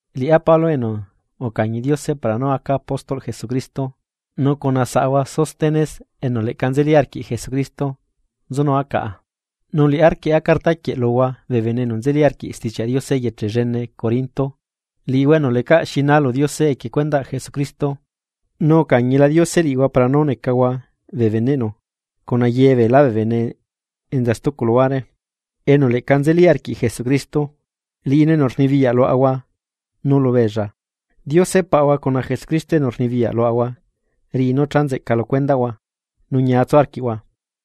Liꞌá Pablo, enu ucañi Diose para nú aca apóstolꞌ Jesucristo. Nu cuna saꞌahua Sóstenes enu leꞌca nzeli arquiꞌ Jesucristo nzunua caꞌa, nu liꞌá rquieꞌa cartaquieꞌ luhua bee bene enu nzeli arquiꞌ Stichiaꞌ Diose eyeche llene Corinto, liꞌihua enu lecaꞌ xiná lu Diose equie cuendaꞌ Jesucristo, nu ucañila Diose liꞌihua para nú necahua bee beneꞌnu cuna ye beelá bee bene enza stucu luhuare enu leꞌca nzelila arquiꞌ Jesucristo, liꞌinu enu rnibiyaꞌ luaꞌahua nu lubeella. Diose Paꞌahua cuna Jesucristo enu rnibiyaꞌ luaꞌahua riꞌi nú cha nzeꞌca lu cuendaꞌhua nu ñia tsu arquiaꞌahua.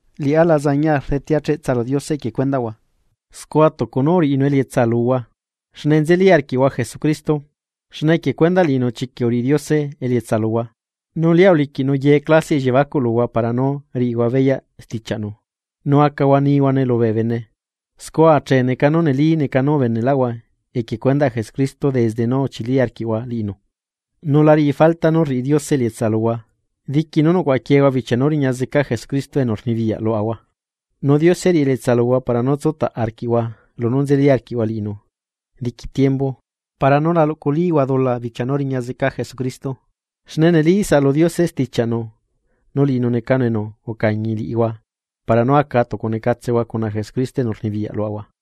Liꞌá la zañia rdetea cheꞌtsa lu Diose equie cuendaꞌhua, scua tucu nú uriꞌinu elietsa luhua, xne nzeli arquiꞌhua Jesucristo. Xne equie cuendaꞌ liꞌinu chiquiꞌ uriꞌi Diose elietsa luhua, nu lia uliquiꞌnu ye clasiaꞌ elliebacuꞌ luhua para nú riꞌihua beyaꞌ stichiaꞌnu, nu acahua nihuane lubee bene. Scua achee neca nú neli neca nú ubeneꞌlaꞌhua equie cuendaꞌ Jesucristo desde nú uchili arquiꞌhua liꞌinu. Nu la riꞌi falta nú rriꞌi Diose elietsa luhua diqui nú nucuaꞌaquiehua bichia nú riña zeca Jesucristo enu rnibiyaꞌ luaꞌahua. Nu Diose riꞌi elietsa luhua para nú tsutaꞌ arquiꞌhua lunú nzeli arquiꞌhua liꞌinu diqui tiembu para nú la luꞌculihua dula bichia nú riña zeca Jesucristo. Xne neli saꞌalu Diose stichaꞌnu, nu liꞌinu necanu enu ucañi liꞌihua para nú aca tucu necatsehua cuna Jesucristo enu rnibiyaꞌ luaꞌahua.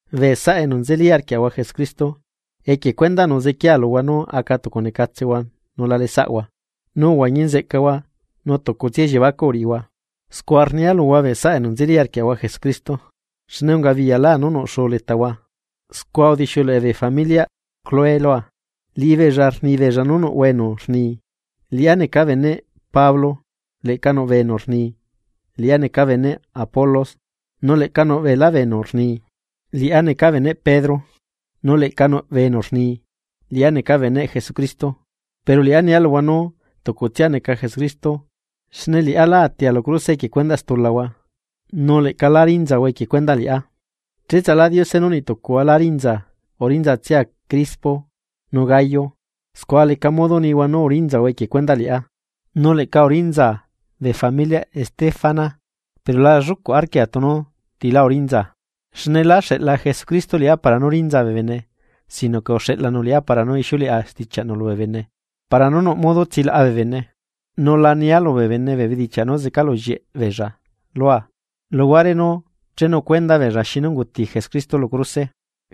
Bee saꞌa enu nzeli arquiaꞌahua Jesucristo, equie cuendaꞌnu zequiea luhua nú aca tucu necatsehua nu la leꞌesaꞌhua. Nu uhuañi nzeꞌcahua nu tucutsia elliebacuꞌ uriꞌihua. Scua rnia luhua bee saꞌa enu nzeli arquiaꞌahua Jesucristo, xne ungabiyalá nú nuꞌ xuu letahua, scua udixiuleꞌe bee familiaꞌ Cloé lua. Liꞌibeella rnibeella nú nuꞌhua enu rni: “Liꞌá neca beneꞌ Pablo”; leꞌca nuꞌ bee enu rni: “Liꞌá neca beneꞌ Apolos”; nu leꞌca nuꞌ beelá bee enu rni: “Liꞌá neca beneꞌ Pedro”; nu leꞌca nuꞌ bee enu rni: “Liꞌá neca beneꞌ Jesucristo.” Pero liꞌá nia luhua nú tucutsia neca Jesucristo xne liꞌá lá atia lu cruse equie cuendaꞌ stulahua, nu leꞌca lá rinzahua equie cuendaꞌ liꞌá. Cheꞌtsalá Diose nú niꞌtucuhua lá rinzaa urinzatsia Crispo nu Gayo. Scua leca modo nihua nú urinzahua equie cuendaꞌ liꞌá. Nu leꞌca urinzaa bee familiaꞌ Estéfanas, pero la llucuꞌ arquia tunu tilá urinzaa. Xne lá xeꞌla Jesucristo liꞌá para nú rinzaa bee bene sino que uxeꞌlanu liꞌá para nú ixiuleꞌa stichiaꞌnu lubee bene para nú nuꞌ modo tsilaꞌa bee bene. Nu la nia lubee bene bee bedichiaꞌ nú zecalullieꞌ beella lua, luguare nú chenu cuenda beella xinu unguti Jesucristo lu cruse.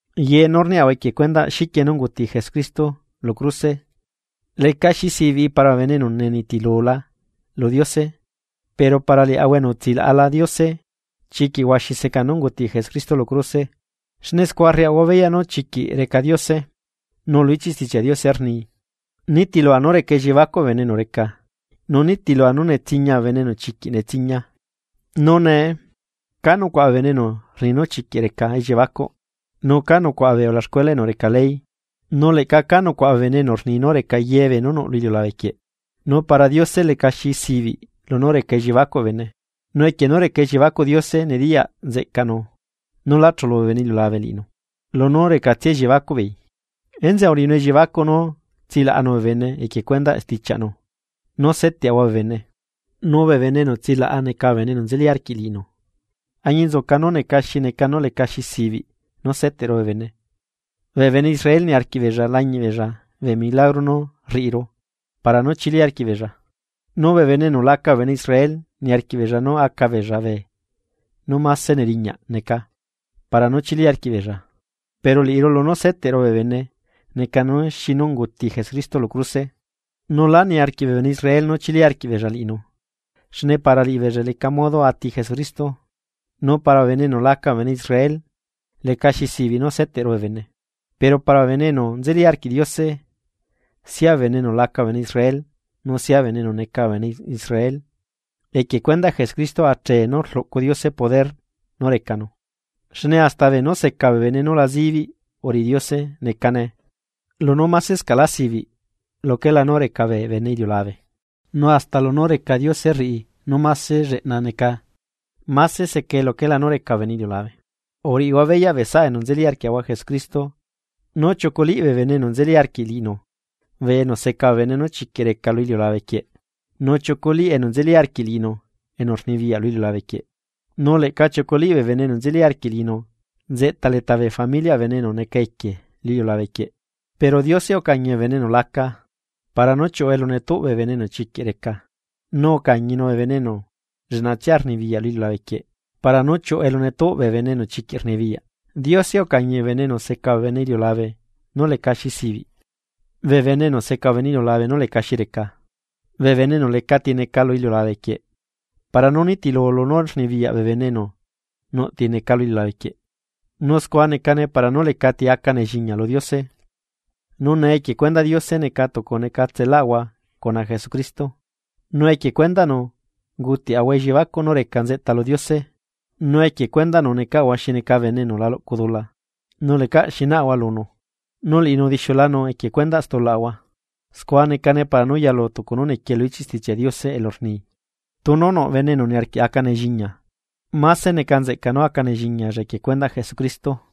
Ye nú rniaꞌahua equie cuendaꞌ xiquie nú unguti Jesucristo lu cruse lecaxi sibiꞌi para bee bene enu nenitilula lu Diose pero para liaꞌahua enu utsilaꞌala Diose, chiquiꞌ huaxi seca nú unguti Jesucristo lu cruse xne scua rriaꞌahua beyaꞌ nú chiquiꞌ reca Diose. Nu lu ichiꞌ Stichiaꞌ Diose rni: Nitilua nú reca elliebacuꞌ bee bene enu reca, nu nitilua nu netsiñia bee bene enu chiquiꞌ netsiñia. Nu nee ¿ca nucuaꞌa bee bene enu rni nu chiquiꞌ reca elliebacuꞌ? ¿Nu ca nucuaꞌa bee ulaxcuela enu reca ley? Nu leꞌca ca nucuaꞌa bee bene enu rni nú reca ye beenú nuꞌ lu iliulabe quieꞌ, nu para Diose lecaxi zibiꞌ lunú reca elliebacuꞌ bee bene. Nu equie nú reca elliebacuꞌ Diose nediyaꞌ nzeꞌcaꞌnu nú lá chulu bee bene illiulabe liꞌinu, lunú recatsia elliebacuꞌ beei, enzeꞌe uriꞌinu elliebacuꞌ nú tsilaꞌanu bee bene equie cuendaꞌ stichiaꞌnu nú seteꞌahua bee bene. Nu bee bene enu tsilaꞌa neca bee enu nzeli arquiꞌ liꞌinu, añinzuca nú neca xi neca nú lecaxi zibiꞌ nú seteꞌru bee bene. Bee bene Israel niarquiꞌ beella lañiꞌbeella bee milagro nú rriꞌiru para nú chili arquiꞌbeella, nu bee bene enu laca bee bene Israel niarquiꞌ beella nú aca beella beenú máse neriñaꞌ neca, para nú chili arquiꞌ beella. Pero liꞌiru lunú seteꞌru bee bene necane nú xinu unguti Jesucristo lu cruse, nu lá niarquiꞌ bee bene Israel nú chili arquiꞌbeella liꞌinu, xne para liꞌibeella leca modo ati Jesucristo, nu para bee bene enu laca bee bene Israel lecaxi sibiꞌ nú seteꞌru bee bene. Pero para bee bene enu nzeli arquiꞌ Diose, sia bee bene enu laca bee bene Israel, nu sia bee bene enu neca bee bene Israel, equie cuendaꞌ Jesucristo achee nú rluꞌcu Diose poder nú recanu. Xne hasta beenú seca bee bene nú la zibiꞌ uriꞌi Diose, necane lunú másescaꞌlá sibiꞌ luquelá nú reca bee bene iliulabe. Nu hasta lunú reca Diose rriꞌi nú máse lleꞌna neca, máse secae luquelá nú reca bee bene iliulabe. Uriꞌihua beyaꞌ bee saꞌa enu nzeli arquiaꞌahua Jesucristo, nú chiuculiꞌ bee bene enu nzeli arquiꞌ liꞌinu bee enu seca bee bene nú chiquiꞌ reca lu iliulabe quieꞌ, nu chiuculiꞌ enu nzeli arquiꞌ liꞌinu enu rnibiyaꞌ lu iliulabe quieꞌ, nu leꞌca chiuculiꞌ bee enu nzeli arquiꞌ liꞌinu nzeꞌta leta bee familiaꞌ bee bene enu neca equie lu iliulabe quieꞌ. Pero Diose ucañi bee bene enu laca, para nú chiuꞌu elu netuꞌ bee bene enu chiquiꞌ reca, nu ucañinu bee enu lleꞌnatsia rnibiyaꞌ lu iliulabe quieꞌ para nú chiuꞌu elu netuꞌ bee enu chiquiꞌ rnibiyaꞌ. Diose ucañi bee bene enu seca bee bene iliulabe nú lecaxi sibiꞌ, bee bene enu seca bee bene iliulabe nú lecaxi reca. Bee bene enu lecati neca lu iliulabe quieꞌ, para nú nitilu lunú rnibiyaꞌ bee bene enu nuꞌ ti neca lu iliulabe quieꞌ. Nu scua necane para nú lecati aca nelliñia lu Diose. Nu nee equie cuendaꞌ Diose neca tucu necatselahua cuna Jesucristo, nu equie cuendaꞌnu ungutiaꞌahua elliebacuꞌ nú reca nzeꞌta lu Diose. Nu equie cuendaꞌnu necaꞌahua xi neca bene enu la luꞌcuaꞌ dula nu lecaꞌ xi naꞌahua lunu, nu liꞌinu udixiulanu equie cuendaꞌ stulaꞌahua. Scua necane para nú yalu tucu nú nequie lu ichiꞌ Stichiaꞌ Diose elu rni: “Tunu nuꞌ bene enu niarquiꞌ aca nelliñia, máse neca nzeꞌca nú aca nelliñialla equie cuendaꞌ Jesucristo.”